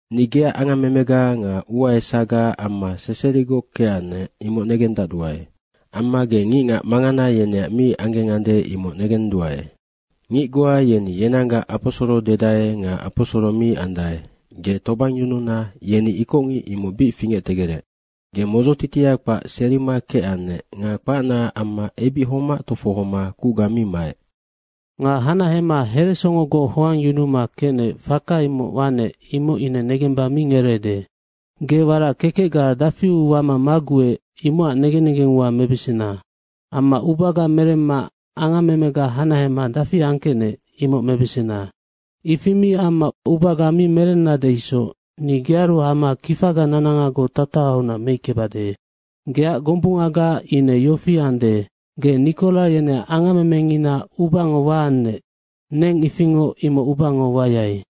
‘Ni geac angammemega nga ua esaga amma seserigoc kecannec, imoc negendacduae. Amma ge ngicngac mangana yeneac mi anggengande, imoc negenduae. Ngic goa yeni yenanggac aposoro dedae nga aposoro mi andae, ge tobangyununa yeni ikocngic, imoc bic fingectegerec. Ge modzotitia kpac serima kecannec nga kpacnaac amma ebic homac tofohoma kucga mi maec.’” “Nga hanahema heresongogoc hoangyunuma kecnec, faka imoc wanec, imoc ine negemba mi ngereede. Ge warac kekecga dafiu wama maguec, imocac negen negeng ua mebesena. Amma ubaga meremma angammemega hanahema dafi angkecnec, imoc mebesena. Ifi mi amma ubaga mi merennade isoc ni gearu hama kifaga nanangagoc tatahaunac meickebade. Geac gombungaga ine yofi ande, ge Nikora yeneac angammemengina ubango waannec, neng ifingoc imoc ubango wayai.”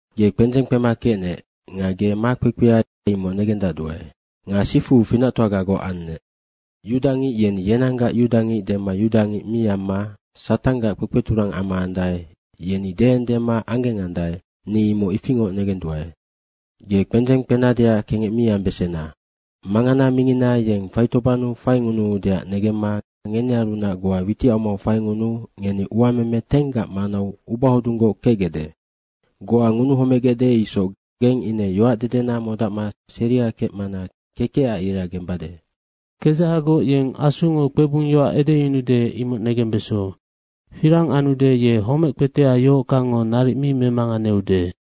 Ge kpendzeng kpema kecnec nga ge makpekpea, imoc negendacduae. Nga sifu finactoagagoc annec. Yudangic yeni yenanggac yudangic dema yudangic mi amma Satanggac kpekpeturang ama andae, yeni deendema anggengandae, ni imoc ifingoc negenduae. Ge kpendzeng kpenadeac kengec mi ambesena. Mangana mingina yeng faitobannu faingunuudeac negemma ngenearunac goa witicamau faingunuu ngeni uameme 10gac manau ubahodunggoc kecgecde. Goa ngunuhomegecde isoc geng ine yoacdedena modacma seria kecmana kekecac ira gembade.” “Kedzahagoc yeng Asungo kpebung yoac edeyunude, imoc negembeso. Firang anude, ye homec kpetea yohockangngo naric mi memanganeude.”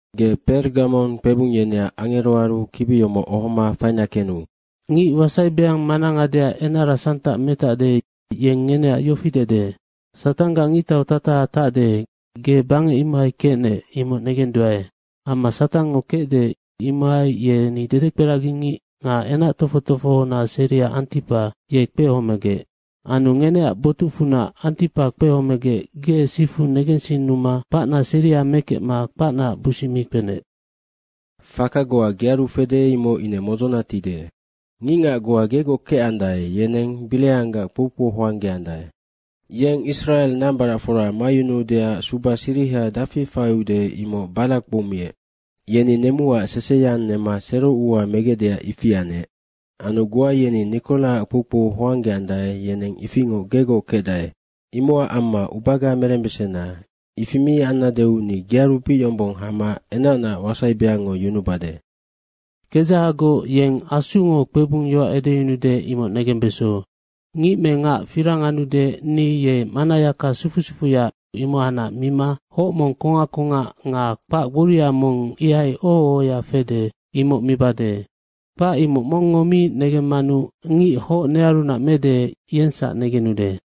“Ge Pegamong kpebung yeneac angeroaru kibi yomoc ohoma faina kenu.” “Ngic wasai beang mana ngadea enara santac metacde, yeng ngeneac yofi dede, ‘Satanggac ngictau tataha tacde, ge bangec imohai kecnec, imoc negenduae. Amma Satangngo kecde, imohai yeni dedekperagingic nga enactofoc tofohona seria Antipa, ye kpehomegec. Anu ngeneac botucfunac Antipa kpehomegec ge sifu negensinnuma kpacna seria mekecma kpacnaac busic mi kpenec.’” “Faka goa gearu fede, imoc ine modzona tide. Ngicngac goa gegoc kecandae, yeneng Bireanggac kpoukpou hoanggeandae. Yeng Israe nambaracfora mayunuudeac suba siriha dafi faiude, imoc Barake kpoumiec. Yeni nemuac seseyang nema sero ua megecdeac ifi anec. Anu goa yeni Nikoraac kpoukpou hoanggeandae, yeneng ifingoc gegoc kecdae. Imocac amma ubaga merembesena. Ifi mi annadeu ni gearu bic yombong hama enacnaac wasai beangngo yunubade.” “Kedzahagoc yeng Asungo kpebung yoac edeyunude, imoc negembeso. Ngic me ngac firang anude, ni ye mannayaka sufu sufuya, imohacnac mima hoc mong kongac kongac nga kpac gboria mong ihai oho ohoya fede, imoc mibade. Kpac imoc mongngo mi negemmanu ngic hoc nearunac mede, yengsac negenude.”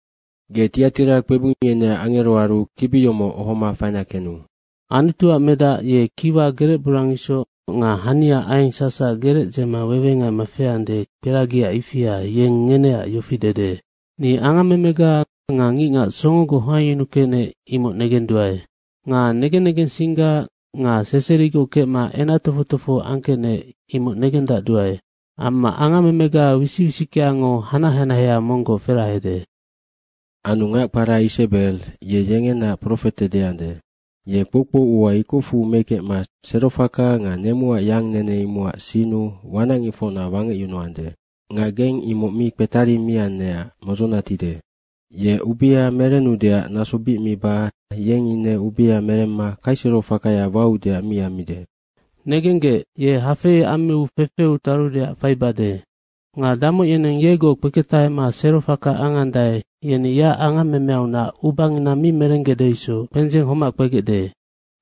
“Ge Tiatira kpebung yeneac angeroaru kibi yomoc ohoma faina kenu.” “Anutuac medac ye kiwa gerec borang isoc nga hania aieng sacsac gerec dzema wewengaima feande, kperagia ifia, yeng ngeneac yofi dede, ‘Ni angammemega nga ngicngac songogoc hoangyunukecnec, imoc negenduae. Nga negen negensingga nga seserigoc kecma enactofoc tofoho angkecnec, imoc negendacduae. Amma angammemega wisic wisickeango hanac hanahea monggoc ferahade.’” “Anu ngac kpara Isebe, ye yengenaac profete deande. Ye kpoukpou ua ikocfu mekecma serofaka nga nemuac yang nene, imocac sinnu wanacngicfocna wangecyunuande. Nga geng imoc mi kpetarimiannecac modzona tide. Ye ubea merennudeac naso bic miba yeng ine ubea meremma kaiserofakaya waudeac mi ammide.” “Negenggec, ye hafei ammiu fefeu tarudeac faibade. Nga damoc yeneng yegoc kpeketahema serofaka angandae, yeni yeac angammemeaunac ubangina mi merenggecde isoc kpendzeng homac kpegecde.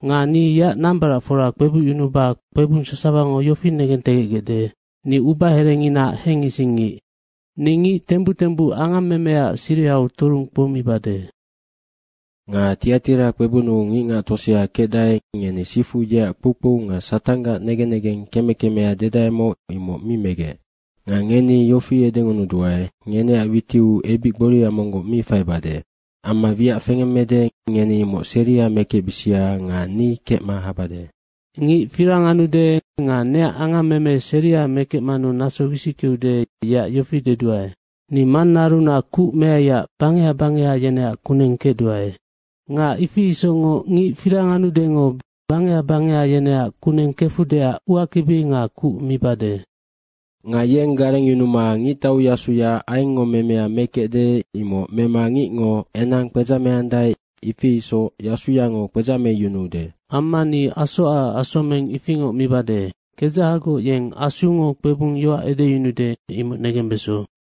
Nga ni yeac nambaracfora kpebucyunuba kpebung sasawango yofi negentegecgecde, ni ubaherenginaac hengisingngic. Ni ngic tembuc tembuc angammemeaac sirihau turung kpoumibade. Nga Tiatira kpebunnu ngicngac tosea kecdae, ngeni sifu yeac kpoukpou nga Satanggac negen negeng keme kemea dedaemoc, imoc mi megec. Nga ngeni yofi edengunuduae, ngeneac witiu ebic gboria monggoc mi faibade. Amma wiac fengemmede, ngeni imoc seria mekecbisia nga ni kecma habade.” “Ngic firang anude nga neac angammeme seria mekecmanu naso wisickeude, yeac yofi deduae. Ni Mannaarunac kuc meaiac bangeha bangeha yeneac kuneng kecduae. Nga ifi isocngoc ngic firang anudengo bangeha bangeha yeneac kuneng kefudeac uakibi nga kuc mibade. ‘Nga yeng garengyunuma ngictauyasuya aiengngo memea mekecde, imoc mema ngicngo enang kpedzameandae, ifi isoc yasuyango kpedzameyunuude.’ Amma ni asoacac asomeng ifingoc mibade. Kedzahagoc yeng Asungo kpebung yoac edeyunude, imoc negembeso.”